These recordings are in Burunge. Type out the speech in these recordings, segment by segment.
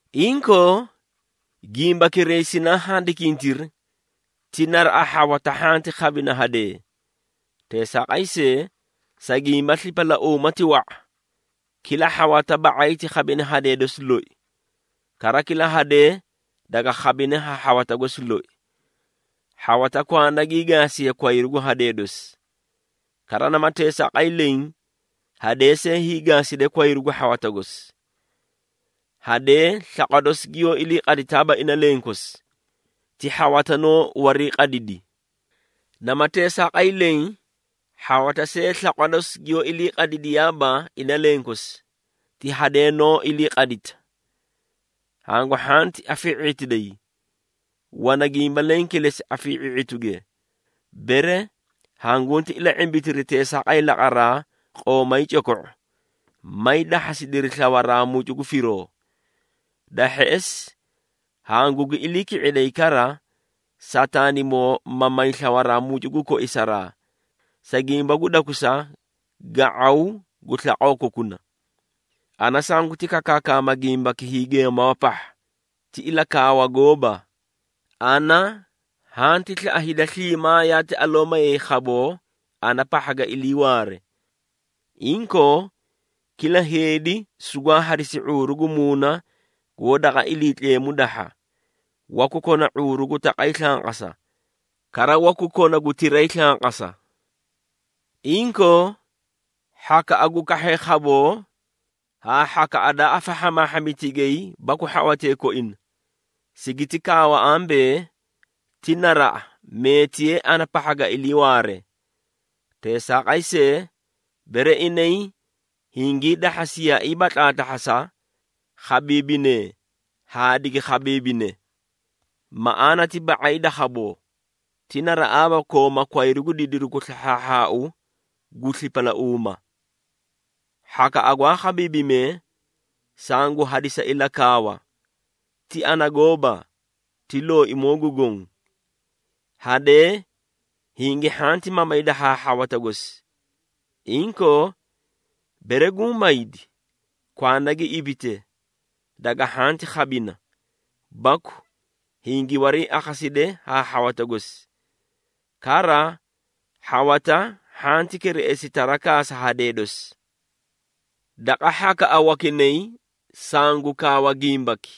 Inkoo, gimbakiray sinaa handikintiri, ti naraꞌa, hhawata hhanti khabina hadee. Teesaaqay see, sa gimba slipalauuma ti wa⁄a, kila hhawata ba⁄ay ti khabine hadee dosi loi, kara kila hadee daga khabine ha hhawata gosi loi. Hhawata kwanda gii gaasiye kwayru gu hadee dosi. Kara nama teesaaqay leẽ, hadee see hiigaaside kwayru gu hhawata gosi. Hadee slaqwa dosi giyoó iliiqaditaaba ina lenkosi, ti hhawata noó wariiqadidi. Nama teesaaqay leẽ, hhawata see slaqwa dosi giyoó iliiqadidiyaaba ina lenkosi, ti hadee noó iliiqadita. Hangu hhanti afii⁄itidayi. Wana gimba leẽ kilesi afii⁄i⁄ituge, bere hanguti ila⁄imbitiri teesaaqay laqaraa qoomay coko⁄u, may dahhasidiri slawaraa mucu gu firoo. Da hheꞌesi hangugi ilii ki⁄iday kara, Sataanimoo ma may slawaraa mucu gu koisaraa, sa gimba gu dakusa ga⁄aw gu slaqoo kokuna. Ana sanguti kakaakaama gimbaki hiigeemawa pahha, ti ilakaawa gooba. Ana hanti slaꞌa hida sliimaa yaati aloo mayay khaboo ana pahha ga iliiwaare. Inkoo, kila heedi sugwaa hadisi ⁄uuru gu muuna goó daqa Iliitleemu dahha, waku kona ⁄uuru gu taqay slanqasa, kara waku kona gu tiray slanqasa. Inkoo, hhakaꞌa gu kahhee khaboo haa hhakaꞌa daa afahhamaahhami tigay baku hhawatee koina, sigiti kaawa ambee, ti naraꞌa meetiyee ana pahha ga iliiwaare. Teesaaqay see, bere inay hingii dahhasiyaaiiba tlaatlahhasa, khabiibinee haa digi khabiibine. Maꞌaana ti ba⁄ay da khaboo, ti naraꞌaaba kooma kwayru gu didiru gu slahhaahhaau gu slipalauuma. Hhakaꞌa gwaa khabiibimee, sangu hadisa ilakaawa (ti ana gooba, ti Looimoo gu Goõ). Hadee hingi hhanti mamayda haa hhawata gosi. Inkoo, bere guũ maydi, kwanda gi ibite, daga hhanti khabina, baku hingi wariiakhaside haa hhawata gosi. Kara hhawata hhanti kereꞌesi tarakaa sa hadee dosi. Daqa hhakaꞌa wakinay sangu kaawa gimbaki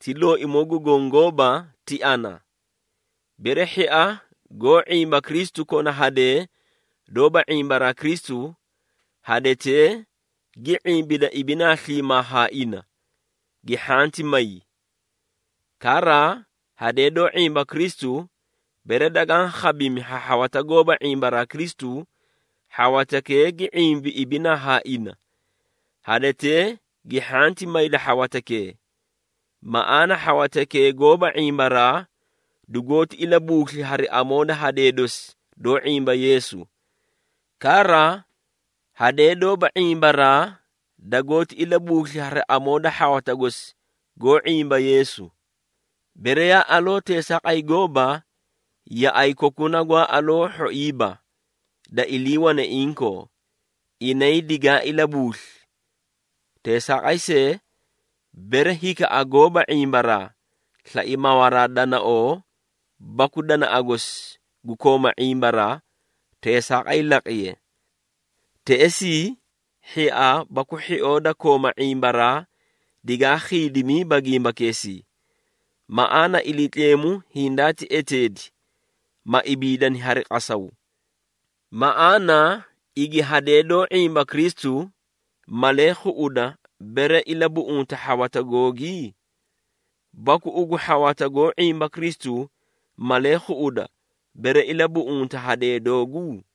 (ti Looimoo gu Goõ gooba, ti ana). Bere hhia goó ⁄imba Kristu kona hadee doóba ⁄imbaraa Kristu, hadetee gi ⁄imbida ibinaa sliimaa haa ina, gi hhanti may. Kara, hadee doó ⁄imba Kristu, bere dagaã khabimi ha hhawata goóba ⁄imbaraa Kristu, hhawatakee gi ⁄imbi ibinaa haa ina, hadetee gi hhanti mayda hhawatakee. Maꞌaana hhawatakee goóba ⁄imbaraa dugoóti ilabuusli hari amoo da hadee dosi doó ⁄imba Yeesu. Kara, hadee doóba ⁄imbaraa dagoóti ilabuusli hari amoo da hhawata gosi goó ⁄imba Yeesu. Bere yaa aloo teesaaqay gooba, yaꞌay kokuna gwaa aloo hhoiiba, da iliiwane inkoo, inay digaa ilabuusli. Teesaaqay see, bere hikaꞌa goóba ⁄imbaraa, slai mawaraa danaoo baku danaꞌa gosi gu kooma ⁄imbaraa, teesaaqay laqiye. Teꞌesii hhia baku hhioo da kooma ⁄imbaraa digaa khiidimiiba gimbakeesii. Maꞌaana Iliitleemu hindaati eteedi, ma ibiidani hari qasaw. Maꞌaana igi hadee doó ⁄imba Kristu, malee khuꞌuda bere ilabuꞌunta hhawata googi? Baku ugu hhawata goó ⁄imba Kristu, malee khuꞌuda bere ilabuꞌunta hadee doogu?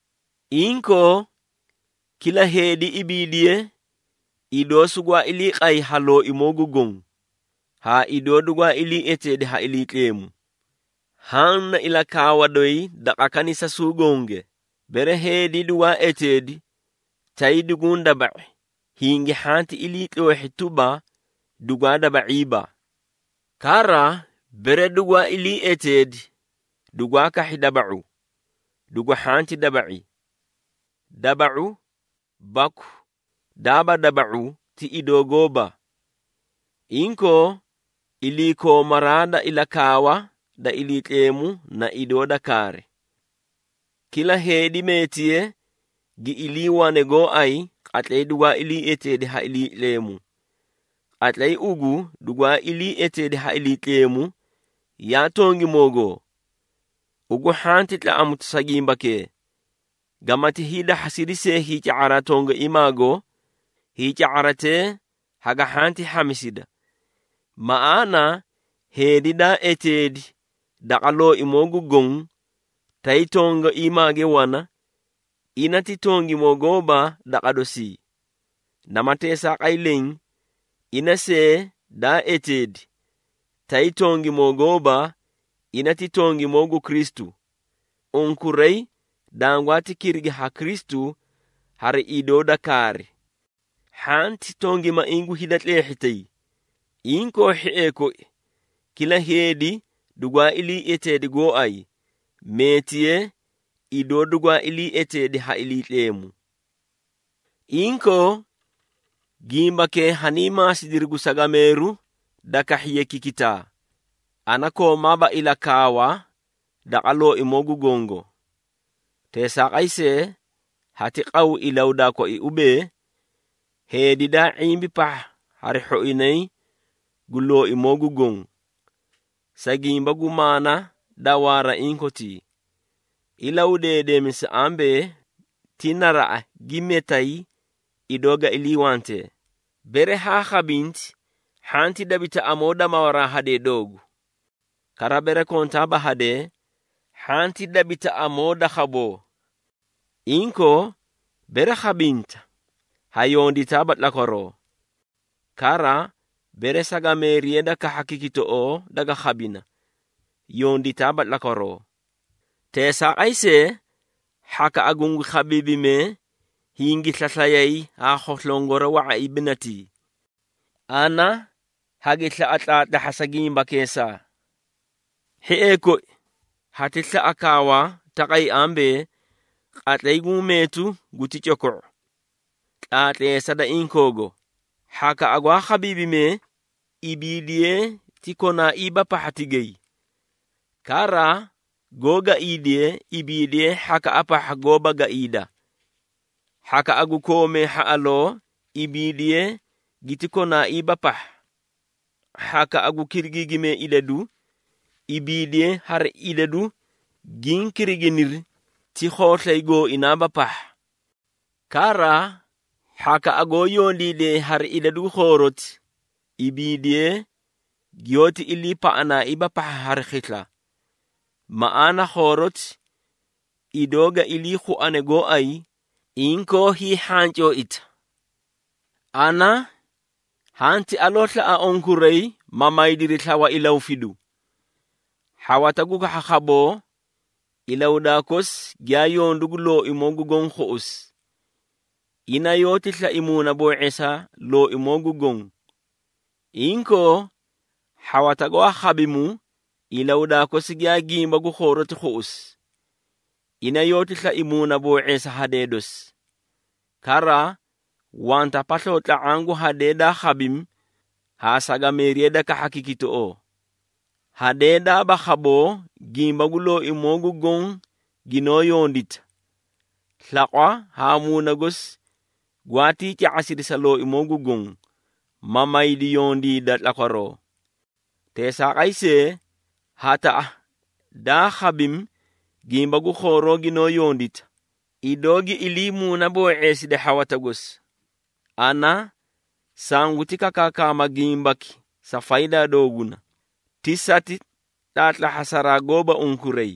Inkoo, kila heedi ibiidiye, idoo sugwaa ilii qay ha Looimoo gu Goõ, haa idoo dugwaa ilii eteedi ha Iliitleemu. Haã na ilakaawa doyi daqa kanisasuu gonge. Bere heedi dugwaa eteedi, tay duguũ daba⁄i, hingi hhanti iliitloohhi tuba, dugwaa daba⁄iiba. Kara, bere dugwaa ilii eteedi dugwaa kahhi daba⁄u, dugu hhanti daba⁄i. Daba⁄u baku daaba daba⁄u ti idoo gooba. Inkoo, iliikoomaraa da ilakaawa da Iliitleemu na idoo da kaari. Kila heedi meetiye, giyaa iliiwane gooay qatlay dugwaa ilii eteedi ha Iliitleemu. Qatlay ugu dugwaa ilii eteedi ha Iliitleemu, yaa tongimoogoo? Ugu hhanti tlaꞌamuta sa gimbakee. Gamati hiidahhasidi see hiica⁄araa tongaiimaago, hiica⁄aratee haga hhanti hhamisida. Maꞌaana heedi daa eteedi daqa Looimoo gu Goõ, tay tongaiimaage wana, ina ti tongimoo gooba daqa dosii. Nama teesaaqay leẽ, ina see daa eteedi, tay tongimoo gooba, ina ti tongimoo gu Kristu. Unkuray dangwaati kirigi ha Kristu hari idoo da kaari. Hhanti tongimaiĩ gu hida tleehhitay. Inkoo, hhiee koi, kila heedi dugwaa ilii eteedi gooay, meetiye idoo dugwaa ilii eteedi ha Iliitleemu. Inkoo, gimbakee hanii maasidiri gu sagameeru da kahhiye kikitaa, ana koomaaba ilakaawa daqa Looimoo gu Gongo. Teesaaqay see, hati qaw ilahudaa koi ubee, heedi daa ⁄imbi pahha hari hhoinay gu Looimoo gu Goõ. Sa gimba gu maana da waara inkotii, ilahudeedemisa ambee, ti naraꞌa gi metay idoo ga iliiwantee. Bere haa khabinti, hhanti dabita amoo da mawaraa hadee doogu. Kara, bere kontaaba hadee, hhanti dabita amoo da khaboo. Inkoo, bere khabinta, ha yonditaaba tlakwaroo. Kara, bere sagameeriya da kahha kikitoꞌoo daga khabina, yonditaaba tlakwaroo. Teesaaqay see, hhakaꞌa gungi khabiibimee hingi slaslayii haa khoslongora wa⁄a ibinatii. Ana hagi slaꞌa tlaatlahhasa gimbakeesaa. Hhiee koi, hati slaꞌa kaawa taqay ambee, qatlay guũ meetu guti coko⁄u. Tlaatleesa da inkoogo, hhakaꞌa gwaa khabiibime, ibiidiyee ti konaaiiba pahha tigay. Kara goó gaiidee, ibiidiyee hhakaꞌa pahha goóba gaiida. Hhakaꞌa goó koomee hhaꞌaloo, ibiidiyee giti konaaiiba pahha. Hhakaꞌa gu kirigiigimee idadu, ibiidiyee hari idadu giĩ kiriginiri ti khooslay gooinaaba pahha. Kara hhakaꞌa goó yondiidee hari idadu gu khooroti, ibiidiye giyoóti iliipaꞌanaaiiba pahha hari khisla. Maꞌaana khooroti idoo ga ilii khuane gooay, inkoo hiihhancooida. Ana hanti aloo slaꞌa unkuray, ma maydiri slawa ilahufidu. Hhawata gu kahha khaboo, ilahudaa kosi giyaa yondu gu Looimoo gu Goõ khuꞌusi. Ina yoóti slai muunaboo⁄eesa Looimoo gu Goõ. Inkoo, hhawata gwaa khabimu, ilahudaa kosi giyaa gimba gu khooroti khuꞌusi. Ina yoóti slai muunaboo⁄eesa hadee dosi. Kara, wanta pasloo tla⁄aã gu hadee daa khabimi haa sagameeriya da kahha kikitoꞌoo. Hadee daaba khaboo gimba gu Looimoo gu Goõ ginoó yondita, slaqwa haa muuna gosi gwaatii ca⁄asidi sa Looimoo gu Goõ, ma maydi yondiida tlakwaroo. Teesaaqay see, hataꞌa daa khabimi, gimba gu khooroo ginoó yondita, idoo gi ilii muunaboo⁄eeside hhawata gosi. Ana sanguti kakaakama gimbaki sa faydaa dooguna, ti sati tlaatlahhasaraa gooba unkuray.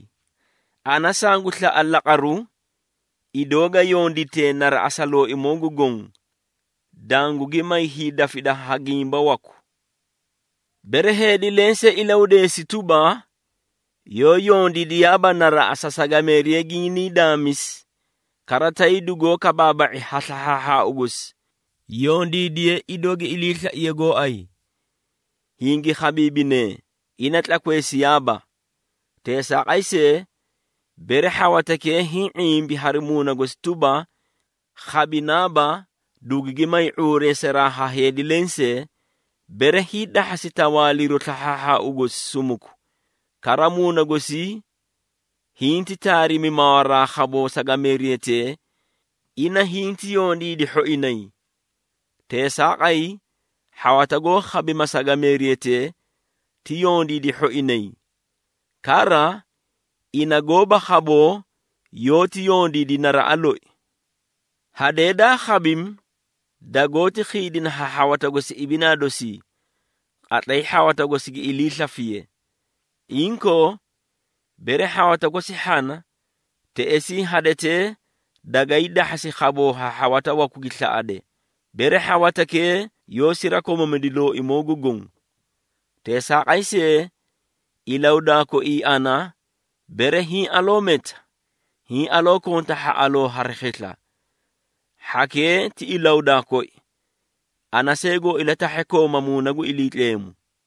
Ana sangu slaꞌa laqaru, idoo ga yonditee naraꞌa sa Looimoo gu Goõ, dangugi may hiidafida ha gimba waku. Bere heedi lensee ilahudeesi tuba, yoó yondiidiyaaba naraꞌa sa sagameeriya ginii daamisi, kara tay dugoó kabaaba⁄i ha slahhaahhaau gosi, yondiidiye idoo gi iliislaiye gooay. Hingi khabiibinee, ina tlakweesiyaaba. Teesaaqay see, bere hhawatakee hiĩ ⁄imbi hari muuna gosi tuba, khabinaaba, dugugi may ⁄uureesaraa ha heedi lensee, bere hiidahhasi tawaaliru slahhaahhaau gosi sumuku, kara muuna gosii hinti taarimi mawaraa khaboo sagameeriyatee, ina hinti yondiidi hhoinay. Teesaaqay, hhawata goó khabima sagameeriyatee, ti yondiidi hhoinay. Kara, ina goóba khaboo yoóti yondiidi naraꞌa loi. Hadee daa khabimi, dagoóti khiidina ha hhawata gosi ibinaa dosii, qatlay hhawata gosi gi ilii slafiye. Inkoo, bere hhawata gosi hhana, teꞌesii hadetee dagay dahhasi khaboo ha hhawata waku gi slaꞌade, bere hhawatakee yoó sirakomamidi Looimoo gu Goõ. Teesaaqay see, ilahudaa koii ana, bere hiĩ aloo meta, hiĩ aloo konta hhaꞌaloo hari khisla. Hhakee ti ilahudaa koi, ana see goo ilatahhe kooma Muuna gu Iliitleemu.